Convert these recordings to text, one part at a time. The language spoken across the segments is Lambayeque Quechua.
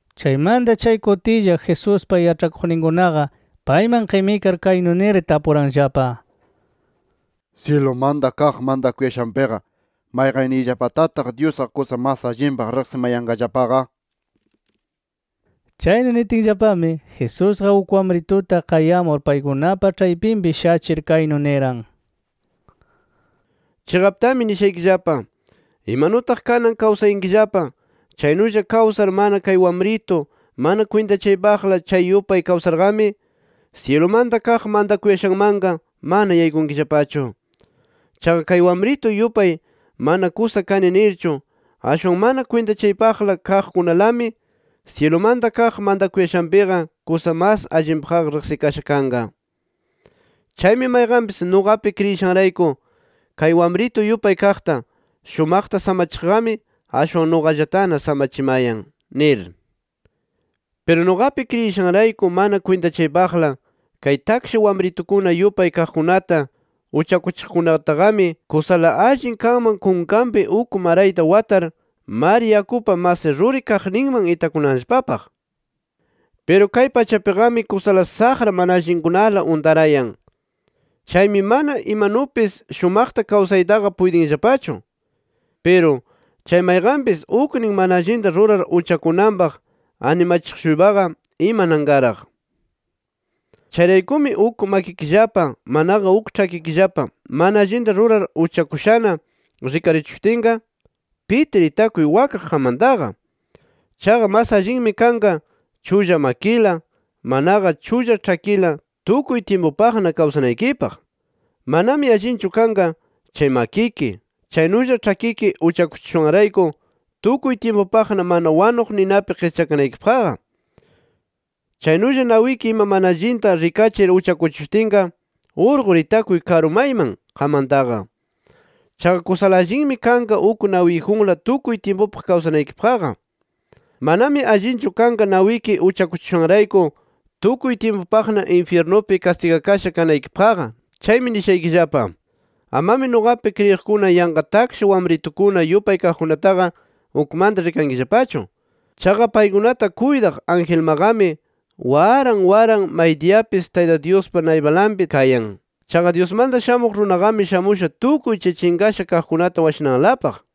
Chaymanta chay kutilla Jesuspa yaĉhakuqninkunaqa payman qimikar kaynu nir tapuranllapa: —Syilumanta kaq mantakuyashanpiqa ¿mayqanniyllapatataq Dyusqa kusa mas allinpaq rikamayanqallapaqa? nir. Chaynu nitinllapami Jesusqa uk wamrituta qayamur paykunapa ĉhaypinpi shachir, kaynu niran: —Chiqaptami nishaykillapa: Imanutaq kanan kawsayankillapa, chaynulla kawsar mana kay wamritu mana kwintachaypaqla chay yupay kawsarqami, syilumanta kaq mantakuyashanmanqa mana yaykunkillapachu. Chaqa kay wamritu yupay mana kusa kani nirchu ashwan mana kwintachaypaqla kaqkunalami, syilumanta kaq mantakuyashanpiqa kusa mas allinpaqqa riqsikasha kanqa. Chaymi mayqanpis nuqapi kriyishanrayku kay wamritu yupay kaqta, shumaqta samachiqqami, ashwan nuqallatana samachimayan nir. “Piru nuqapi kriyishanrayku mana kwintachaypaqla kay taksha wamritukuna yupay kaqkunata uchakuchiqkunataqami, kusala allin kanman kunkanpi uk marayta watar, mar yakupa mas ruri kaqninman itakunanllapapaq. Piru kay pachapiqami kusala saqra mana allinkunala untarayan. Chaymi mana imanupis shumaqta kawsayllapataqa puytinllapachu. Piru, chay mayqanpis uknin mana allinta rurar uchakunanpaq animachiq-shuypaqa imananqaraq. “Chayraykumi uk makikillapa manaqa uk ĉhakikillapa mana allinta rurar uchakushana rikarichishutinqa, pitir itakuy wakaq qammantaqa. Chaqa mas allinmi kanqa chulla makila, manaqa chulla ĉhakila tukuy tyimpupaqna kawsanaykipaq. Manami allinchu kanqa chay makiki, chaynulla ĉhakiki uchakuchishushanrayku tukuy tyimpupaqna mana wanuq ninapi qischakanaykipaqqa. Chaynulla nawiki ima mana allinta rikachir uchakuchishutinqa, urqur itakuy karu mayman qammantaqa. Chaqa kusa allinmi kanqa uk nawiyjunla tukuy tyimpupaq kawsanaykipaqqa. Manami allinchu kanqa nawiki uchakuchishushanrayku, tukuy tyimpupaqna infyirnupi kastigakasha kanaykipaqqa nir. “Chaymi nishaykillapa: Amami nuqapi kriyiqkuna yanqa taksha wamritukuna yupay kaqkunataqa ukmanta rikankillapachu. Chaqa paykunata kuytaq angelmaqami waran waran maydiyapis Tayta Dyuspa naypalanpi kayan. [Chaqa Dyusmanta Shamuq Runaqami shamusha tukuy chay chinqasha kaqkunata washananlapaq.]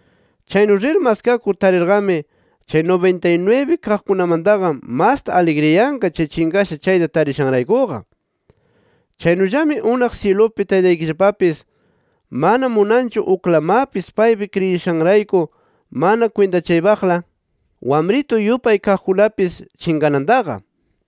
Chaynu rir maskakur, tarirqami chay nubintay-nwibi kaqkunamantaqa masta aligriyanqa chay chinqasha chayta tarishanraykuqa. Chaynullami unaq syilupi Taytaykillapapis mana munanchu uklamapis paypi kriyishanrayku mana kwintachaypaqla wamritu yupay kaqkunapis chinqanantaqa.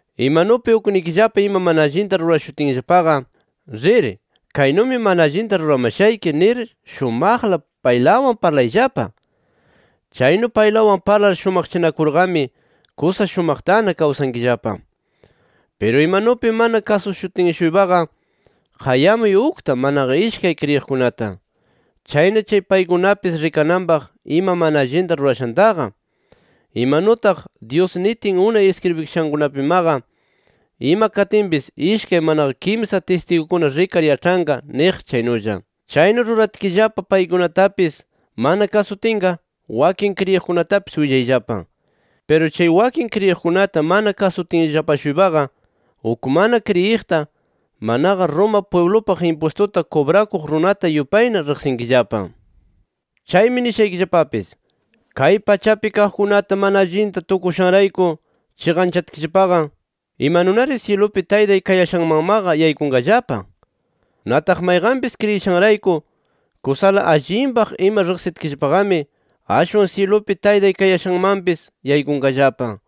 “Imanupi uknikillapa ima mana allinta rurashutinllapaqa, rir, ‘Kaynumi mana allinta ruramashayki’ nir shumaqla paylawan parlayllapa. Chaynu paylawan parlar shumaqchanakurqami, kusa shumaqtana kawsankillapa. Piru imanupi mana kasushutin-shuypaqa, qayamuy ukta manaqa ishkay kriyiqkunata. Chayna chay paykunapis rikananpaq ima mana allinta rurashantaqa, imanutaq Dyus nitin unay iskribishankunapimaqa, ima katinpis ishkay manaqa kimsa tistigukuna rikar yaĉhanqa niq chaynulla. Chaynu ruratkillapa paykunatapis mana kasutinqa, wakin kriyiqkunatapis willayllapa. Piru chay wakin kriyiqkunata mana kasutinllapa-shuypaqa, uk mana kriyiqta, manaqa Roma pwiblupaq impwistuta kubrakuq runata yupayna riqsinkillapa. “Chaymi nishaykillapapis: Kay pachapi kaqkunata mana allinta tukushanrayku chiqanchatkillapaqa, ¿imanunari syilupi Taytay kayashanmanmaqa yaykunqallapa? Nataq mayqanpis kriyishanrayku kusala allinpaq ima riqsitkillapaqami, ashwan syilupi Taytay kayashanmanpis yaykunqallapa.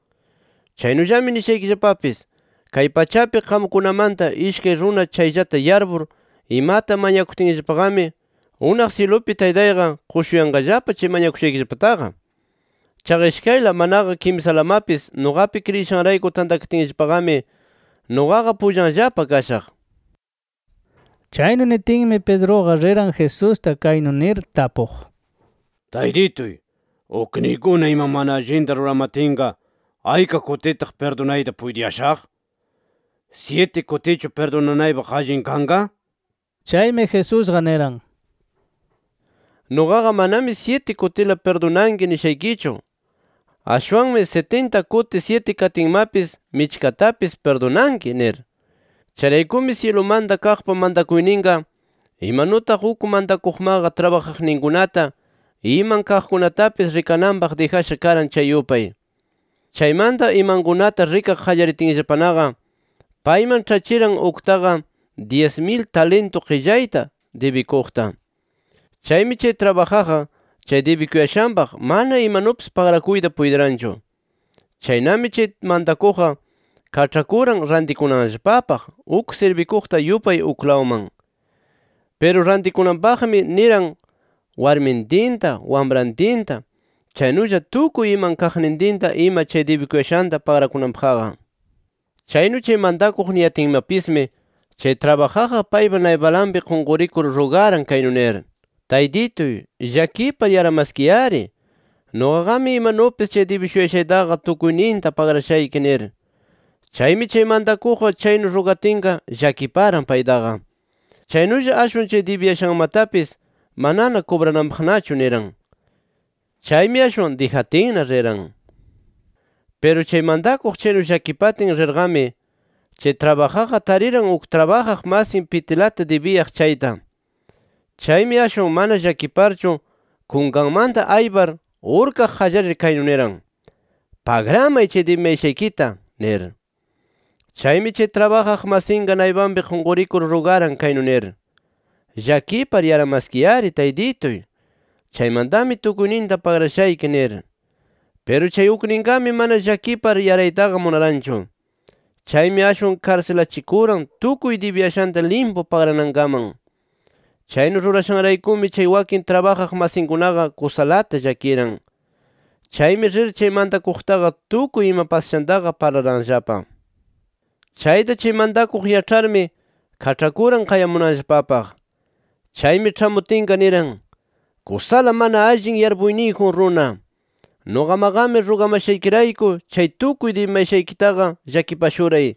“Chaynullami nishaykillapapis: Kay pachapi qamkunamanta ishkay runa chayllata yarpur imata mañakutkillapaqami, unaq syilupi Taytayqa qushuyanqallapa chay mañakushaykillapataqa. Chaqa ishkayla, manaqa kimsalamapis nuqapi kriyishanrayku tantakatinllapaqami, nuqaqa pullanllapa kashaq”. Chaynu nitinmi Pedruqa riran Jesusta kaynu nir tapuq: —Taytituy ¿ukniykuna ima mana allinta ruramatinqa ayka kutitaq pirdunayta puytiyashaq? ¿Syiti kutichu pirdunanaypaq allin kanqa? Chaymi Jesusqa niran: —Nuqaqa manami syiti kutila pirdunanki nishaykichu. Ashwanmi sitinta kuti syiti katinmapis michkatapis pirdunanki nir. “Chayraykumi syilumanta kaqpa mantakuyninqa, imanutaq uk mantakuqmaqa trabajaqninkunata iman kaqkunatapis rikananpaq dijasha karan chay yupay. Chaymanta imankunata rikaq qallaritinllapanaqa payman ĉhachiran uktaqa dyis mil talintu qillayta dibikuqta. Chaymi chay trabajaqqa chay dibikuyashanpaq mana imanupis pagrakuyta puytiranchu. Chaynami chay mantakuqqa kaĉhakuran rantikunanllapapaq uk sirbikuqta yupay uklawman. Piru rantikunanpaqmi niran warmintinta, wamrantinta, chaynulla tukuy iman kaqnintinta ima chay dibikuyashanta pagrakunanpaqqa. Chaynu chay mantakuq niyatinmapismi, chay trabajaqqa paypa naypalanpi qunqurikur rugaran kaynu nir: ‘Taytituy llakipar yaramaskiy-ari. Nuqaqami imanupis chay dibishuyashaytaqa tukuyninta pagrashayki’ nir. Chaymi chay mantakuqqa chaynu rugatinqa llakiparan paytaqa. Chaynulla ashwan chay dibiyashanmatapis manana kubrananpaqnachu niran. Chaymi ashwan dijatinna riran. “Piru chay mantakuq chaynu llakipatin rirqami, chay trabajaqqa tariran uk trabajaq masin pitilata dibiyaq chayta. Chaymi ashwan mana llakiparchu kunkanmanta aypar urkaq qallarir, kaynu niran: ‘¡Pagramay chay dibimayashaykita!’ nir. Chaymi chay trabajaq masinqa naypanpi qunqurikur rugaran kaynu nir: ‘Llakipar yaramaskiy-ari taytituy. Chaymantami tukuyninta pagrashayki’ nir. Piru chay ukninqami, mana llakipar yaraytaqa munaranchu. Chaymi ashwan karsilachikuran tukuy dibiyashanta limpu pagranankaman. Chaynu rurashanraykumi chay wakin trabajaq masinkunaqa kusalata llakiran. Chaymi rir chay mantakuqtaqa tukuy ima pasashantaqa parlaranllapa. Chayta chay mantakuq yaĉharmi, kaĉhakuran qayamunanllapapaq. Chaymi ĉhamutinqa niran: ‘¡Kusala mana allin yarpuyniyjun runa!, nuqamaqami rugamashaykirayku chay tukuy dibimayashaykitaqa llakipashuray.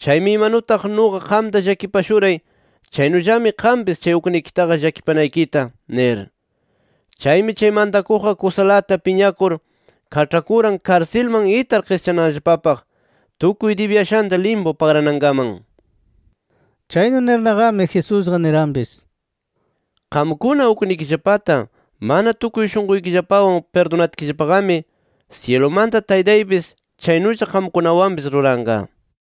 Chaymi imanutaq nuqa qamta llakipashuray chaynullami qampis chay uknikitaqa llakipanaykita’ nir. Chaymi chay mantakuqqa kusalata piñakur kaĉhakuran karsilman itar qischananllapapaq, tukuy dibiyashanta limpu pagranankaman”. Chaynu nirnaqami, Jesusqa niranpis: “Qamkuna uknikillapata mana tukuy shunquykillapawan pirdunatkillapaqami, syilumanta Taytaypis chaynulla qamkunawanpis ruranqa” nir.